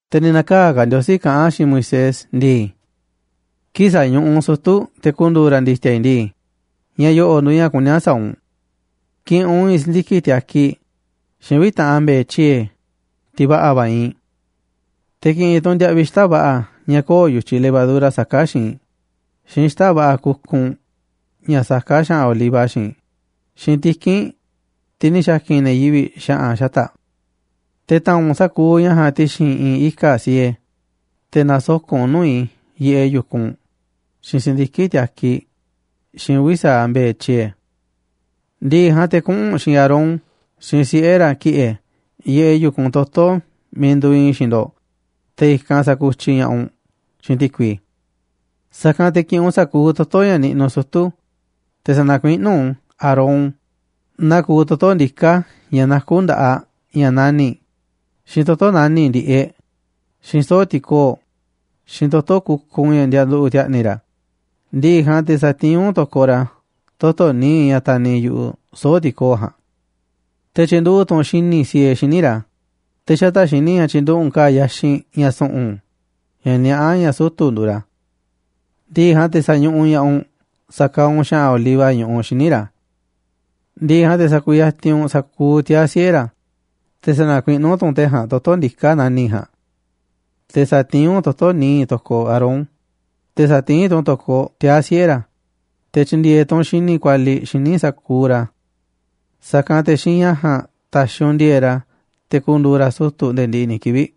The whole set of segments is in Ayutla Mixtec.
Te̱ ni̱ na̱kaa̱ ka̱ Ndiosí kaꞌán a̱ xiinꞌ Moisés ndii: ―Kii̱ꞌ sa̱ñuꞌuꞌ u̱nꞌ sutu̱ te̱ ku̱ndu̱u̱ ra̱ ndi̱ti̱a̱ i̱ ndii, ña̱ yo̱ꞌo̱ꞌ nduuꞌ ña̱ kuní a̱ sa̱a̱ u̱nꞌ: ki̱ꞌi̱n u̱nꞌ i̱i̱n si̱ndiki̱ꞌ tiakiꞌ xiinꞌ uvi̱ taꞌan mbe̱e̱ tyiee̱, tiꞌ va̱ꞌa̱ va̱ iinꞌ. Te̱ ki̱ꞌi̱n tu̱ u̱nꞌ ndiaꞌviꞌ xita̱ꞌ va̱ꞌa̱ ña̱ köo̱ꞌ yu̱tyiꞌ levadura saká xiinꞌ, xiinꞌ xita̱ꞌ va̱ꞌa̱ kukunꞌ ña̱ saká xa̱ꞌa̱n oliva xiinꞌ, xiinꞌ tiki̱nꞌ, tiꞌ ni̱ xa̱ki̱n ne̱ yivi̱ꞌ xa̱ꞌa̱n xata̱ꞌ. Te̱ ta̱a̱nꞌ u̱nꞌ sa̱kuuꞌ ña̱ ja̱a̱nꞌ ti̱xi̱n i̱i̱n ika̱ꞌ siee, te̱ na̱soko̱ꞌ u̱nꞌ u̱n nuu̱ꞌ i̱ yiꞌeꞌ yu̱kunꞌ, xiinꞌ si̱ndiki̱ꞌ tiakiꞌ, xiinꞌ uvi̱ sa̱aꞌ mbe̱e̱ tyiee̱. ’Ndiꞌiꞌ ja̱a̱nꞌ te̱ kuꞌu̱n u̱nꞌ xiinꞌ Aarón xiinꞌ siꞌe̱ ra̱ ki̱ꞌe̱ yiꞌeꞌ yu̱kunꞌ toto̱ miiꞌ nduuꞌ iinꞌ xiinꞌ ndo̱ꞌ, te̱ i̱kanꞌ sa̱kutyiꞌ ña̱ꞌaꞌ u̱nꞌ xiinꞌ ti̱kui. Sa̱kanꞌ te̱ ki̱ꞌi̱n u̱nꞌ sa̱kuuꞌ toto̱ ña̱ niꞌnuꞌ sutu̱, te̱ sa̱na̱kuiꞌnú u̱nꞌ u̱n Aarón naa kuuꞌ toto̱ ndiká ña̱ nakú nda̱ꞌaꞌ ña̱ nani̱ꞌ, xiinꞌ toto̱ nani̱ꞌ ndi̱ꞌeꞌ, xiinꞌ soo̱ꞌ ti̱koo̱ꞌ, xiinꞌ toto̱ kukunꞌ ña̱ ndianduꞌu̱ꞌ ti̱a̱ꞌni̱ ra̱. Ndi̱ꞌi̱ ja̱a̱nꞌ te̱ sa̱tiín u̱nꞌ to̱koꞌ ra̱ toto̱ nii̱ꞌ ña̱ taniꞌ yu̱ꞌuꞌ soo̱ꞌ ti̱koo̱ꞌ ja̱a̱nꞌ. Te̱ tyi̱nduꞌu̱ꞌ tu̱ u̱nꞌ xini̱ꞌ siee xíniꞌ ra̱, te̱ xata̱ꞌ xini̱ꞌ ja̱a̱nꞌ tyi̱nduꞌu̱ꞌ u̱nꞌ ka̱a̱ yaxinꞌ ña̱ su̱ꞌu̱n, ña̱ niaꞌá ña̱ sutu̱ nduuꞌ ra̱. Ndi̱ꞌi̱ ja̱a̱nꞌ te̱ sa̱ñuꞌuꞌ ña̱ꞌaꞌ u̱nꞌ sa̱kaaꞌ u̱nꞌ xa̱ꞌa̱n oliva ñuꞌuꞌ xíniꞌ ra̱. Ndi̱ꞌi̱ ja̱a̱nꞌ te̱ sa̱ku̱yatinꞌ u̱nꞌ sa̱kuuꞌ tiaa̱ siꞌe̱ ra̱, te̱ sa̱na̱kuiꞌnú tu̱ u̱nꞌ te̱ ja̱a̱nꞌ toto̱ ndiká nani̱ꞌ ja̱a̱nꞌ. Te̱ sa̱tiín tu̱ u̱nꞌ toto̱ níiꞌ to̱koꞌ Aarón, te̱ sa̱tiín tu̱ u̱nꞌ u̱n to̱koꞌ tiaa̱ siꞌe̱ ra̱, te̱ tyi̱ndi̱e̱e̱ tu̱ u̱nꞌ xini̱ꞌ kualiꞌ xíniꞌ sa̱kuuꞌ ra̱. Sa̱kanꞌ te̱ xiinꞌ ña̱ ja̱a̱nꞌ ta̱xi̱ u̱nꞌ ndi̱e̱e̱ꞌ ra̱ te̱ ku̱ndu̱u̱ ra̱ sutu̱ nde̱e̱ ndiꞌiꞌ ni̱ kivi̱ꞌ.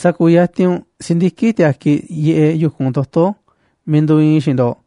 ’Sa̱ku̱yatinꞌ u̱nꞌ si̱ndiki̱ꞌ tiakiꞌ yiꞌeꞌ yu̱kunꞌ toto̱ miiꞌ nduuꞌ iinꞌ i̱ xiinꞌ ndo̱ꞌ,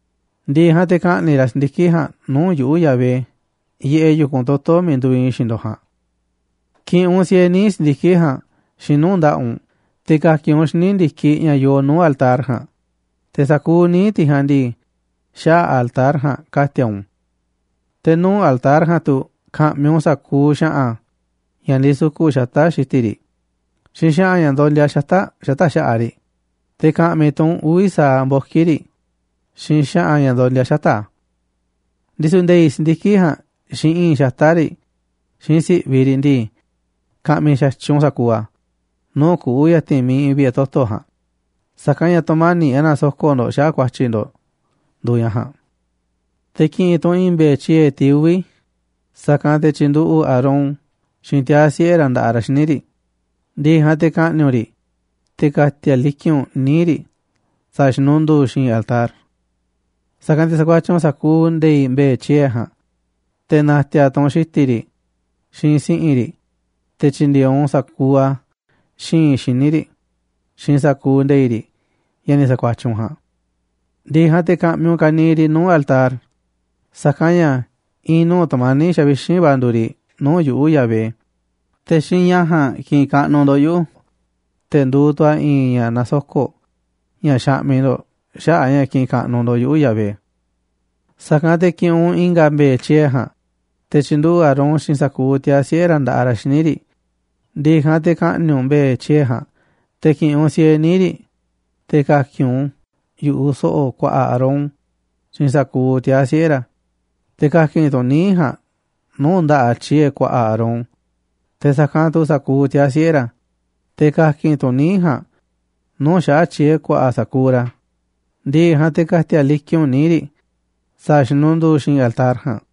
Ndi̱ꞌi̱ ja̱a̱nꞌ te̱ ka̱ꞌni̱ꞌ ra̱ si̱ndiki̱ꞌ ja̱a̱nꞌ nuu̱ꞌ yuꞌu̱, Yahvé, yiꞌeꞌ yu̱kunꞌ toto̱ miiꞌ nduuꞌ iinꞌ i̱ xiinꞌ ndo̱ꞌ ja̱a̱nꞌ. Ki̱ꞌi̱n u̱nꞌ siee níiꞌ si̱ndiki̱ꞌ ja̱a̱nꞌ xiinꞌ nuu̱ꞌ nda̱ꞌaꞌ u̱nꞌ te̱ ka̱ki̱n u̱nꞌ u̱n xíniꞌ ndi̱kiꞌ ña̱ yoo nuu̱ꞌ altar ja̱a̱nꞌ, te̱ sa̱kuuꞌ níiꞌ tiꞌ ja̱a̱nꞌ ndii, xaꞌa̱ꞌ altar ja̱a̱nꞌ ka̱ti̱a̱ u̱nꞌ u̱n. Te̱ nuu̱ꞌ altar ja̱a̱nꞌ tu̱ ka̱ꞌmi̱ u̱nꞌ sa̱kuuꞌ xa̱ꞌa̱n ña̱ ndisuku̱ꞌ xata̱ꞌ xi̱ti̱ riꞌ xiinꞌ xa̱ꞌa̱n ña̱ ndondia xata̱ꞌ xata̱ꞌ xa̱ꞌaꞌ riꞌ, te̱ ka̱ꞌmi̱ tu̱ u̱nꞌ uvi̱ sa̱aꞌ mboki̱ riꞌ xiinꞌ xa̱ꞌa̱n ña̱ ndondia xata̱ꞌ a̱. Ndisu̱ nde̱i̱ꞌ si̱ndiki̱ꞌ ja̱a̱nꞌ, xiinꞌ i̱i̱nꞌ xata̱ꞌ riꞌ, xiinꞌ si̱ꞌviꞌ riꞌ ndii, ka̱ꞌmi̱ xa̱tyiꞌ u̱nꞌ sa̱kuuꞌ a̱ nuu̱ꞌ kuꞌu̱ ya̱ti̱n miiꞌ iinꞌ vi̱ꞌe̱ toto̱ ja̱a̱nꞌ, sa̱kanꞌ ña̱ tu̱mani̱ꞌ ña̱ nasoko̱ꞌ ndo̱ꞌ xaꞌa̱ꞌ ku̱a̱tyi̱ ndo̱ꞌ nduuꞌ ña̱ ja̱a̱nꞌ. ’Te̱ ki̱ꞌi̱n tu̱ u̱nꞌ i̱i̱n mbe̱e̱ tyiee̱, tiꞌ uvi̱, sa̱kanꞌ te̱ tyi̱nduꞌu̱ꞌ Aarón xiinꞌ tiaa̱ siꞌe̱ ra̱ nda̱ꞌaꞌ ra̱ xíniꞌ riꞌ. Ndi̱ꞌi̱ ja̱a̱nꞌ te̱ ka̱ꞌni̱ꞌ u̱nꞌ riꞌ, te̱ ka̱ti̱a̱ liki̱nꞌ u̱nꞌ níiꞌ riꞌ sa̱a̱ xinunduu xi̱i̱nꞌ altar. Sa̱kanꞌ te̱ sa̱kuatyiꞌ u̱nꞌ sa̱kuuꞌ nde̱i̱ꞌ mbe̱e̱ tyiee̱ ja̱a̱nꞌ, te̱ na̱ti̱a̱ tu̱ u̱nꞌ xi̱ti̱ riꞌ, xiinꞌ si̱ꞌi̱n riꞌ, te̱ tyi̱ndi̱e̱e̱ u̱nꞌ sa̱kuuꞌ a̱ xi̱i̱nꞌ xíniꞌ riꞌ xiinꞌ sa̱kuuꞌ nde̱i̱ꞌ riꞌ ña̱ ni̱ sa̱kuatyiꞌ u̱nꞌ ja̱a̱nꞌ. Ndi̱ꞌi̱ ja̱a̱nꞌ te̱ ka̱ꞌmi̱ u̱nꞌ ka̱niiꞌ riꞌ nuu̱ꞌ altar, sa̱kanꞌ ña̱ i̱i̱n nuu̱ꞌ tu̱mani̱ꞌ xavixínꞌ va̱ nduuꞌ riꞌ nuu̱ꞌ yuꞌu̱, Yahvé. Te̱ xiinꞌ ña̱ ja̱a̱nꞌ kiꞌinꞌ kaꞌnuꞌ ndo̱ꞌ yuꞌu̱, te̱ nduuꞌ tu̱ a̱ i̱i̱n ña̱ nasoko̱ꞌ, ña̱ xaꞌmiꞌ ndo̱ꞌ xaꞌa̱ꞌ a̱ ña̱ kiꞌinꞌ kaꞌnuꞌ ndo̱ꞌ yuꞌu̱, Yahvé. ’Sa̱kanꞌ te̱ ki̱ꞌi̱n u̱nꞌ i̱nga̱ mbe̱e̱ tyiee̱ ja̱a̱nꞌ, te̱ tyi̱nduꞌu̱ꞌ Aarón xiinꞌ sa̱kuuꞌ tiaa̱ siꞌe̱ ra̱ nda̱ꞌaꞌ ra̱ xíniꞌ riꞌ. Ndi̱ꞌi̱ ja̱a̱nꞌ, te̱ ka̱ꞌni̱ꞌ u̱nꞌ mbe̱e̱ tyiee̱ ja̱a̱nꞌ, te̱ ki̱ꞌi̱n u̱nꞌ siee níiꞌ riꞌ, te̱ ka̱ki̱n u̱nꞌ u̱n yu̱ꞌuꞌ so̱ꞌo̱ ku̱a̱ꞌa̱ Aarón xiinꞌ sa̱kuuꞌ tiaa̱ siꞌe̱ ra̱. Te̱ ka̱ki̱n tu̱ u̱nꞌ níiꞌ ja̱a̱nꞌ nuu̱ꞌ nda̱ꞌaꞌ tyiee̱ ku̱a̱ꞌa̱ Aarón, te̱ sa̱kanꞌ tu̱ sa̱kuuꞌ tiaa̱ siꞌe̱ ra̱. Te̱ ka̱ki̱n tu̱ u̱nꞌ níiꞌ ja̱a̱nꞌ nuu̱ꞌ xaꞌa̱ꞌ tyiee̱ ku̱a̱ꞌa̱ sa̱kuuꞌ ra̱. Ndi̱ꞌi̱ ja̱a̱nꞌ te̱ ka̱ti̱a̱ liki̱nꞌ u̱nꞌ níiꞌ riꞌ sa̱a̱ xinunduu xi̱i̱nꞌ altar ja̱a̱nꞌ.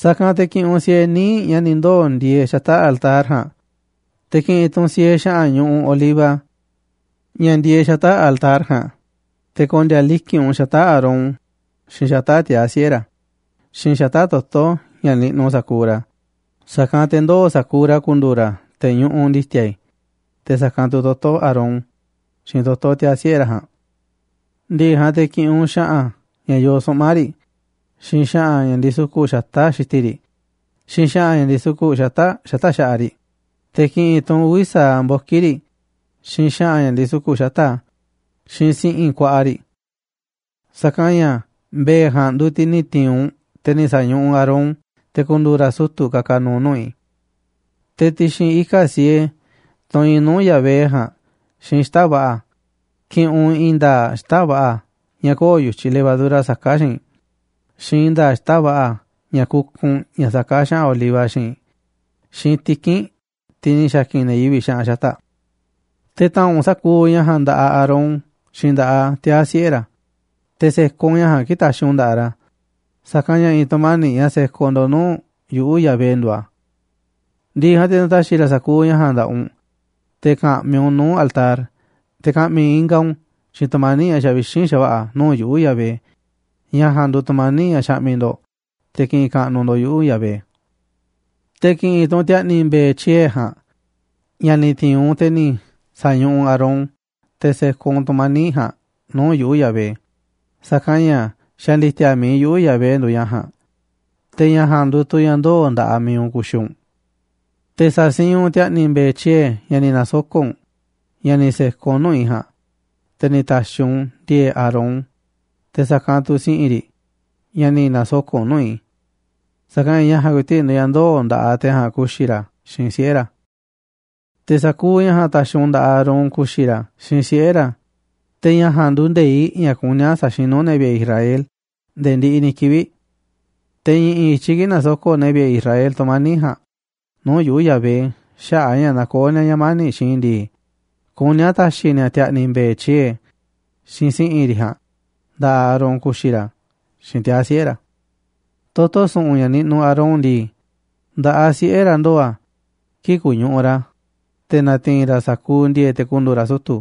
Sa̱kanꞌ te̱ ki̱ꞌi̱n u̱nꞌ siee níiꞌ ña̱ ni̱ ndoo̱ ndieeꞌ xata̱ꞌ altar ja̱a̱nꞌ, te̱ ki̱ꞌi̱n tu̱ u̱nꞌ siee xa̱ꞌa̱n ñuꞌuꞌ oliva ña̱ ndieeꞌ xata̱ꞌ altar ja̱a̱nꞌ, te̱ ko̱ndi̱a̱ liki̱nꞌ u̱nꞌ u̱n xata̱ꞌ Aarón, xiinꞌ xata̱ꞌ tiaa̱ siꞌe̱ ra̱, xiinꞌ xata̱ꞌ toto̱ ña̱ niꞌnuꞌ sa̱kuuꞌ ra̱, sa̱kanꞌ te̱ ndoo̱ sa̱kuuꞌ ra̱ ku̱ndu̱u̱ ra̱ te̱ ñuꞌuꞌ ndi̱ti̱a̱ i̱, te̱ sa̱kanꞌ tu̱ toto̱ Aarón xiinꞌ toto̱ tiaa̱ siꞌe̱ ra̱ ja̱a̱nꞌ. ’Ndi̱ꞌi̱ ja̱a̱nꞌ te̱ ki̱ꞌi̱n u̱nꞌ xa̱ꞌa̱n ña̱ yoo suꞌma̱ꞌ riꞌ, xiinꞌ xa̱ꞌa̱n ña̱ ndisuku̱ꞌ xata̱ꞌ xi̱ti̱ riꞌ, xiinꞌ xa̱ꞌa̱n ña̱ ndisuku̱ꞌ xata̱ꞌ xata̱ꞌ xa̱ꞌaꞌ riꞌ, te̱ ki̱ꞌi̱n tu̱ u̱nꞌ uvi̱ sa̱aꞌ mboki̱ riꞌ, xiinꞌ xa̱ꞌa̱n ña̱ ndisuku̱ꞌ xata̱ꞌ a̱, xiinꞌ si̱ꞌi̱n ku̱a̱ꞌa̱ riꞌ. Sa̱kanꞌ ña̱ mbe̱e̱ ja̱a̱nꞌ nduuꞌ tiꞌ ni̱ ti̱i̱n u̱nꞌ, te̱ ni̱ sa̱ñuꞌuꞌ u̱nꞌ Aarón te̱ ku̱ndu̱u̱ ra̱ sutu̱ ka̱ka̱ nu̱u̱ nuu̱ꞌ i̱. Te̱ ti̱xi̱n ika̱ꞌ siee, tunꞌ iinꞌ nuu̱ꞌ Yahvé ja̱a̱nꞌ xiinꞌ xita̱ꞌ va̱ꞌa̱ ki̱ꞌi̱n u̱nꞌ i̱i̱n nda̱a̱ꞌ xita̱ꞌ va̱ꞌa̱ ña̱ köo̱ꞌ yu̱tyiꞌ levadura saká xiinꞌ, xiinꞌ i̱i̱n nda̱a̱ꞌ xita̱ꞌ va̱ꞌa̱ ña̱ kukunꞌ ña̱ saká xa̱ꞌa̱n oliva xiinꞌ, xiinꞌ tiki̱nꞌ, tiꞌ ni̱ xa̱ki̱n ne̱ yivi̱ꞌ xa̱ꞌa̱n xata̱ꞌ. Te̱ ta̱a̱nꞌ u̱nꞌ sa̱kuuꞌ ña̱ ja̱a̱nꞌ nda̱ꞌaꞌ Aarón xiinꞌ nda̱ꞌaꞌ tiaa̱ siꞌe̱ ra̱, te̱ se̱koꞌ u̱nꞌ ña̱ ja̱a̱nꞌ kii̱ꞌ taxiꞌ u̱nꞌ u̱n nda̱ꞌaꞌ ra̱, sa̱kanꞌ ña̱ i̱i̱n tu̱mani̱ꞌ ña̱ sekoꞌ ndo̱ꞌ nuu̱ꞌ yuꞌu̱, Yahvé, nduuꞌ a̱. Ndi̱ꞌi̱ ja̱a̱nꞌ te̱ na̱ta̱xi̱ ra̱ sa̱kuuꞌ ña̱ ja̱a̱nꞌ nda̱ꞌaꞌ u̱nꞌ te̱ ka̱ꞌmi̱ u̱nꞌ u̱n nuu̱ꞌ altar, te̱ ka̱ꞌmi̱ ingaꞌ u̱nꞌ xiinꞌ tu̱mani̱ꞌ ña̱ xavixínꞌ xa̱va̱ꞌa̱ nuu̱ꞌ yuꞌu̱, Yahvé. Ña̱ ja̱a̱nꞌ nduuꞌ tu̱mani̱ꞌ ña̱ xaꞌmiꞌ ndo̱ꞌ te̱ ki̱ꞌi̱n kaꞌnuꞌ ndo̱ꞌ yuꞌu̱, Yahvé. ’Te̱ ki̱ꞌi̱n tu̱ u̱nꞌ ti̱a̱ꞌni̱ mbe̱e̱ tyiee̱ ja̱a̱nꞌ ña̱ ni̱ ti̱i̱n u̱nꞌ, te̱ ni̱ sa̱ñuꞌuꞌ u̱nꞌ Aarón, te̱ se̱koꞌ u̱nꞌ tu̱mani̱ꞌ ja̱a̱nꞌ nuu̱ꞌ yuꞌu̱, Yahvé, sa̱kanꞌ ña̱ xa̱ ndi̱ti̱a̱ mi̱iꞌ yuꞌu̱, Yahvé, nduuꞌ ña̱ ja̱a̱nꞌ. Te̱ ña̱ ja̱a̱nꞌ nduuꞌ tu̱ ña̱ ndoo̱ nda̱ꞌaꞌ mi̱iꞌ u̱nꞌ ku̱xi̱ u̱nꞌ. Te̱ sa̱siinꞌ u̱nꞌ ti̱a̱ꞌni̱ mbe̱e̱ tyiee̱ ña̱ ni̱ na̱soko̱ꞌ u̱nꞌ, ña̱ ni̱ se̱koꞌ u̱nꞌ nuu̱ꞌ i̱ ja̱a̱nꞌ, te̱ ni̱ ta̱xi̱ u̱nꞌ ndi̱e̱e̱ꞌ Aarón, te̱ sa̱kanꞌ tu̱ si̱ꞌi̱n riꞌ ña̱ ni̱ na̱soko̱ꞌ u̱nꞌ nuu̱ꞌ i̱. Sa̱kanꞌ ña̱ ña̱ ja̱a̱nꞌ ku̱i̱ti̱ꞌ nduuꞌ ña̱ ndoo̱ nda̱ꞌaꞌ te̱ ja̱a̱nꞌ ku̱xi̱ ra̱ xiinꞌ siꞌe̱ ra̱. Te̱ sa̱kuuꞌ ña̱ ja̱a̱nꞌ ta̱xi̱ u̱nꞌ nda̱ꞌaꞌ Aarón ku̱xi̱ ra̱ xiinꞌ siꞌe̱ ra̱. Te̱ ña̱ ja̱a̱nꞌ nduuꞌ nde̱iꞌ ña̱ kuní a̱ sa̱xinu̱ ne̱ vi̱ꞌe̱ Israel nde̱e̱ ndiꞌiꞌ ni̱ kivi̱ꞌ. Te̱ i̱ꞌi̱n i̱tyiꞌ kii̱ꞌ na̱soko̱ꞌ ne̱ vi̱ꞌe̱ Israel tu̱mani̱ꞌ ja̱a̱nꞌ nuu̱ꞌ yuꞌu̱, Yahvé, xaꞌa̱ꞌ a̱ ña̱ nakoó ni̱a̱ ña̱ mani̱ꞌ xiinꞌ i̱ ndii, kuní a̱ ta̱xi̱ ni̱a̱ ti̱a̱ꞌni̱ mbe̱e̱ tyiee̱ xiinꞌ si̱ꞌi̱n riꞌ ja̱a̱nꞌ nda̱ꞌaꞌ Aarón ku̱xi̱ ra̱ xiinꞌ tiaa̱ siꞌe̱ ra̱. ’Toto̱ su̱ꞌu̱n ña̱ niꞌnuꞌ Aarón ndii, nda̱ꞌaꞌ siꞌe̱ ra̱ ndoo̱ a̱ kii̱ꞌ ku̱ñuꞌuꞌ ra̱ te̱ na̱ti̱i̱n ra̱ sa̱kuuꞌ ndi̱e̱e̱ꞌ te̱ ku̱ndu̱u̱ ra̱ sutu̱.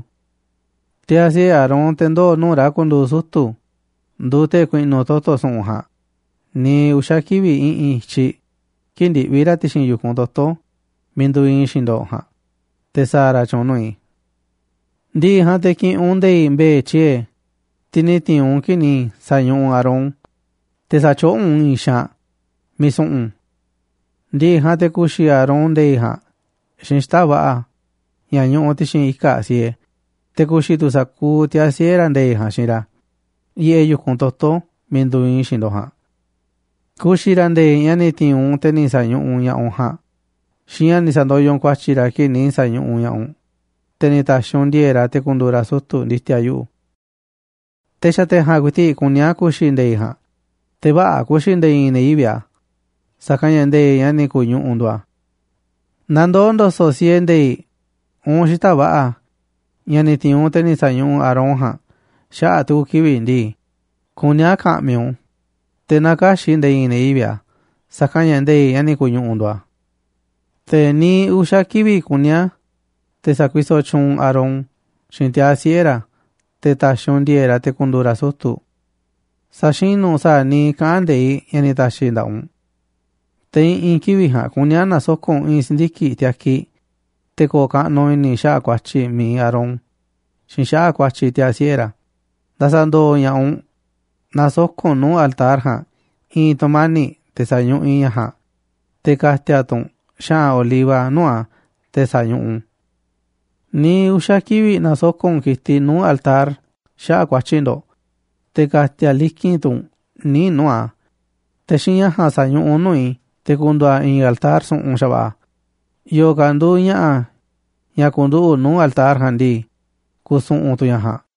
Tiaa̱ siꞌe̱ Aarón, te̱ ndoo̱ nuu̱ꞌ ra̱ ku̱ndu̱u̱ sutu̱ nduuꞌ te̱ ku̱i̱ꞌnu̱ toto̱ su̱ꞌu̱n ja̱a̱nꞌ niiꞌ uxa̱ kivi̱ꞌ i̱ꞌi̱n i̱tyiꞌ kii̱ꞌ ndiꞌvi̱ ra̱ ti̱xi̱n yu̱kunꞌ toto̱ miiꞌ nduuꞌ iinꞌ i̱ xiinꞌ ndo̱ꞌ ja̱a̱nꞌ, te̱ sa̱a̱ ra̱ tyu̱u̱n nuu̱ꞌ i̱. ’Ndi̱ꞌi̱ ja̱a̱nꞌ te̱ ki̱ꞌi̱n u̱nꞌ nde̱i̱ꞌ mbe̱e̱ tyiee̱, tiꞌ ni̱ ti̱i̱n u̱nꞌ kii̱ꞌ ni̱ sa̱ñuꞌuꞌ u̱nꞌ Aarón, te̱ sa̱tyoꞌó u̱nꞌ u̱n i̱i̱n xaanꞌ miiꞌ su̱ꞌu̱n. Ndi̱ꞌi̱ ja̱a̱nꞌ te̱ ku̱xi̱ Aarón nde̱i̱ꞌ ja̱a̱nꞌ xiinꞌ xita̱ꞌ va̱ꞌa̱ ña̱ ñuꞌuꞌ ti̱xi̱n ika̱ꞌ siee, te̱ ku̱xi̱ tu̱ sa̱kuuꞌ tiaa̱ siꞌe̱ ra̱ nde̱i̱ꞌ ja̱a̱nꞌ xiinꞌ ra̱ yiꞌeꞌ yu̱kunꞌ toto̱ miiꞌ nduuꞌ iinꞌ i̱ xiinꞌ ndo̱ꞌ ja̱a̱nꞌ. Ku̱xi̱ ra̱ nde̱i̱ꞌ ña̱ ni̱ ti̱i̱n u̱nꞌ te̱ ni̱ sa̱ñuꞌuꞌ ña̱ꞌaꞌ u̱nꞌ ja̱a̱nꞌ xiinꞌ ña̱ ni̱ sa̱ndoyoꞌ u̱nꞌ ku̱a̱tyi̱ ra̱ kii̱ꞌ ni̱ sa̱ñuꞌuꞌ ña̱ꞌaꞌ u̱nꞌ, te̱ ni̱ ta̱xi̱ u̱nꞌ ndi̱e̱e̱ꞌ ra̱ te̱ ku̱ndu̱u̱ ra̱ sutu̱ ndi̱ti̱a̱ yuꞌu̱. Te̱ xa̱ te̱ ja̱a̱nꞌ ku̱i̱ti̱ꞌ kuní a̱ ku̱xi̱ nde̱i̱ꞌ ja̱a̱nꞌ, te̱ vä̱ꞌa̱ ku̱xi̱ nde̱e̱ i̱i̱n ne̱ yivi̱ꞌ a̱, sa̱kanꞌ ña̱ nde̱i̱ꞌ ña̱ ni̱ ku̱ñuꞌuꞌ nduuꞌ a̱. Naaꞌ ndoo̱ ndo̱so̱ꞌ siee nde̱i̱ꞌ uun xita̱ꞌ va̱ꞌa̱ ña̱ ni̱ ti̱i̱n u̱nꞌ te̱ ni̱ sa̱ñuꞌuꞌ Aarón ja̱a̱nꞌ xaꞌa̱ꞌ tu̱ku̱ kivi̱ꞌ ndii, kuní a̱ ka̱ꞌmi̱ u̱nꞌ u̱n, te̱ na kä̱xi̱ꞌ nde̱e̱ i̱i̱n ne̱ yivi̱ꞌ a̱ sa̱kanꞌ ña̱ nde̱i̱ꞌ ña̱ ni̱ ku̱ñuꞌuꞌ nduuꞌ a̱. ’Te̱ niiꞌ uxa̱ kivi̱ꞌ kuní a̱ te̱ sa̱kuisoꞌ tyuunꞌ u̱nꞌ Aarón xiinꞌ tiaa̱ siꞌe̱ ra̱ te̱ ta̱xi̱ u̱nꞌ ndi̱e̱e̱ꞌ ra̱ te̱ ku̱ndu̱u̱ ra̱ sutu̱. Sa̱xinu̱ u̱nꞌ sa̱a̱ niiꞌ kaꞌán nde̱iꞌ ña̱ ni̱ ta̱xi̱ i̱ nda̱ꞌaꞌ u̱nꞌ. Te̱ i̱ꞌi̱n kivi̱ꞌ ja̱a̱nꞌ kuní a̱ na̱soko̱ꞌ u̱nꞌ i̱i̱n si̱ndiki̱ꞌ tiakiꞌ te̱ ko̱o̱ kaꞌnuꞌ i̱ni̱ i̱ xaꞌa̱ꞌ ku̱a̱tyi̱ mi̱iꞌ Aarón xiinꞌ xaꞌa̱ꞌ ku̱a̱tyi̱ tiaa̱ siꞌe̱ ra̱ nda̱sa̱ndo̱o̱ ña̱ꞌaꞌ u̱nꞌ. Na̱soko̱ꞌ u̱nꞌ nuu̱ꞌ altar ja̱a̱nꞌ i̱i̱n tu̱mani̱ꞌ te̱ sañuꞌuꞌ i̱ ña̱ ja̱a̱nꞌ, te̱ ka̱ti̱a̱ tu̱ u̱nꞌ xa̱ꞌa̱n oliva nuu̱ꞌ a̱ te̱ sa̱ñuꞌuꞌ u̱nꞌ u̱n. Niiꞌ uxa̱ kivi̱ꞌ na̱soko̱ꞌ u̱nꞌ ki̱tiꞌ nuu̱ꞌ altar xaꞌa̱ꞌ ku̱a̱tyi̱ ndo̱ꞌ, te̱ ka̱ti̱a̱ liki̱nꞌ tu̱ u̱nꞌ níiꞌ nuu̱ꞌ a̱, te̱ xiinꞌ ña̱ ja̱a̱nꞌ sa̱ñuꞌuꞌ u̱nꞌ u̱n nuu̱ꞌ i̱, te̱ ku̱ndu̱u̱ a̱ i̱i̱n altar su̱ꞌu̱n xa̱va̱ꞌa̱. Yo̱o̱ ka̱ nduuꞌ ña̱ꞌa̱ ña̱ ku̱nduꞌu̱ꞌ nuu̱ꞌ altar ja̱a̱nꞌ ndii, ku̱su̱ꞌu̱n tu̱ ña̱ ja̱a̱nꞌ.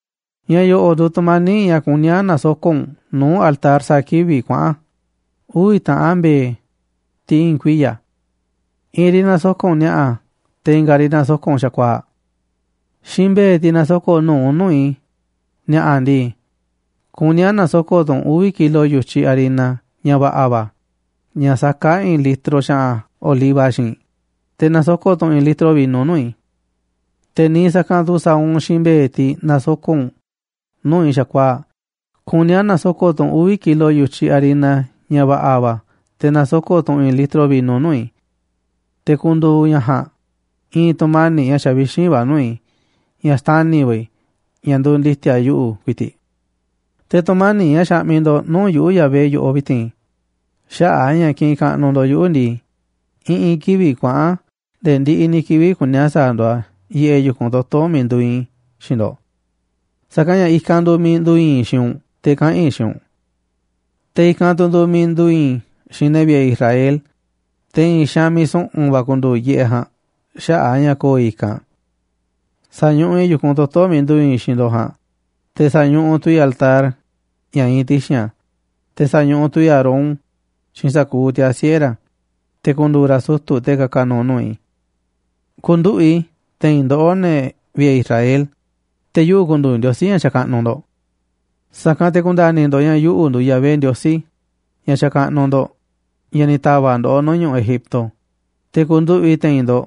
’Ña̱ yo̱ꞌo̱ꞌ nduuꞌ tu̱mani̱ꞌ ña̱ kuní a̱ na̱soko̱ꞌ u̱nꞌ nuu̱ꞌ altar sa̱a̱ kivi̱ꞌ kuaꞌa̱n: uvi̱ taꞌan mbe̱e̱, tiꞌ i̱i̱n kuiya̱. I̱i̱n riꞌ na̱soko̱ꞌ u̱nꞌ ni̱a̱ꞌa̱, te̱ i̱nga̱ riꞌ na̱soko̱ꞌ u̱nꞌ xa̱kuaa̱ꞌ. Xiinꞌ mbe̱e̱, tiꞌ na̱soko̱ꞌ nu̱uꞌ u̱nꞌ nuu̱ꞌ i̱ ni̱a̱ꞌa̱ ndii, kuní a̱ na̱soko̱ꞌ tu̱ u̱nꞌ uvi̱ kilo yu̱tyiꞌ harina ña̱ va̱ꞌa̱ va̱, ña̱ saká i̱i̱n litro xa̱ꞌa̱n oliva xiinꞌ, te̱ na̱soko̱ꞌ tu̱ u̱nꞌ i̱i̱n litro vino nuu̱ꞌ i̱. Te̱ niiꞌ sa̱kanꞌ tu̱ sa̱a̱ u̱nꞌ xiinꞌ mbe̱e̱, tiꞌ na̱soko̱ꞌ u̱nꞌ nuu̱ꞌ i̱ xa̱kuaa̱ꞌ, kuní a̱ na̱soko̱ꞌ tu̱ u̱nꞌ uvi̱ kilo yu̱tyiꞌ harina ña̱ va̱ꞌa̱ va̱, te̱ na̱soko̱ꞌ tu̱ u̱nꞌ i̱i̱n litro vino nuu̱ꞌ i̱. Te̱ ku̱ndu̱u̱ ña̱ ja̱a̱nꞌ i̱i̱n tu̱mani̱ꞌ ña̱ xavixínꞌ va̱ nuu̱ꞌ i̱, ña̱ xtani̱ va̱ i̱, ña̱ nduuꞌ ndi̱ti̱a̱ yuꞌu̱ ku̱i̱ti̱ꞌ. Te̱ tu̱mani̱ꞌ ña̱ xaꞌmiꞌ ndo̱ꞌ nuu̱ꞌ yuꞌu̱, Yahvé, yoꞌoꞌ vi̱ti̱n xaꞌa̱ꞌ a̱ ña̱ kiꞌinꞌ kaꞌnuꞌ ndo̱ꞌ yuꞌu̱ ndii, i̱ꞌi̱n kivi̱ꞌ kuaꞌa̱n nde̱e̱ ndiꞌiꞌ ni̱ kivi̱ꞌ kuní a̱ sa̱a̱ ndo̱ꞌ a̱ yiꞌeꞌ yu̱kunꞌ toto̱ miiꞌ nduuꞌ iinꞌ i̱ xiinꞌ ndo̱ꞌ. Sa̱kanꞌ ña̱ i̱kanꞌ nduuꞌ miiꞌ ndu̱u̱ i̱i̱n i̱ xiinꞌ u̱nꞌ te̱ kaꞌa̱n i̱ xiinꞌ u̱nꞌ. Te̱ i̱kanꞌ tu̱ nduuꞌ miiꞌ ndu̱u̱ i̱i̱n i̱ xiinꞌ ne̱ vi̱ꞌe̱ Israel, te̱ i̱i̱n xaanꞌ miiꞌ su̱ꞌu̱n va̱ ku̱ndu̱u̱ yiꞌeꞌ ja̱a̱nꞌ xaꞌa̱ꞌ a̱ ña̱ ko̱o̱ i̱ i̱kanꞌ. Sa̱ñuꞌuꞌ i̱ yu̱kunꞌ toto̱ miiꞌ nduuꞌ iinꞌ i̱ xiinꞌ ndo̱ꞌ ja̱a̱nꞌ, te̱ sa̱ñuꞌuꞌ tu̱ i̱ altar ña̱ iinꞌ ti̱xi̱n a̱, te̱ sa̱ñuꞌuꞌ tu̱ i̱ Aarón xiinꞌ sa̱kuuꞌ tiaa̱ siꞌe̱ ra̱, te̱ ku̱ndu̱u̱ ra̱ sutu̱, te̱ ka̱ka̱ nu̱u̱ nuu̱ꞌ i̱. Ku̱nduꞌu̱ꞌ i̱ te̱i̱n ndoꞌó, ne̱ vi̱ꞌe̱ Israel, te̱ yuꞌu̱ ku̱ndu̱u̱ Ndiosí ña̱ xakaꞌnuꞌ ndo̱ꞌ. Sa̱kanꞌ te̱ ku̱nda̱ni̱ ndo̱ꞌ ña̱ yuꞌu̱ nduuꞌ Yahvé, Ndiosí ña̱ xakaꞌnuꞌ ndo̱ꞌ, ña̱ ni̱ ta̱va̱ꞌ ndoꞌó nuu̱ꞌ ñu̱ꞌuꞌ Egipto, te̱ ku̱nduꞌu̱ꞌ i̱ te̱i̱n ndo̱ꞌ.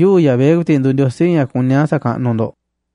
Yuꞌu̱, Yahvé, ku̱i̱ti̱ꞌ nduuꞌ Ndiosí ña̱ kuní a̱ sa̱kaꞌnuꞌ ndo̱ꞌ.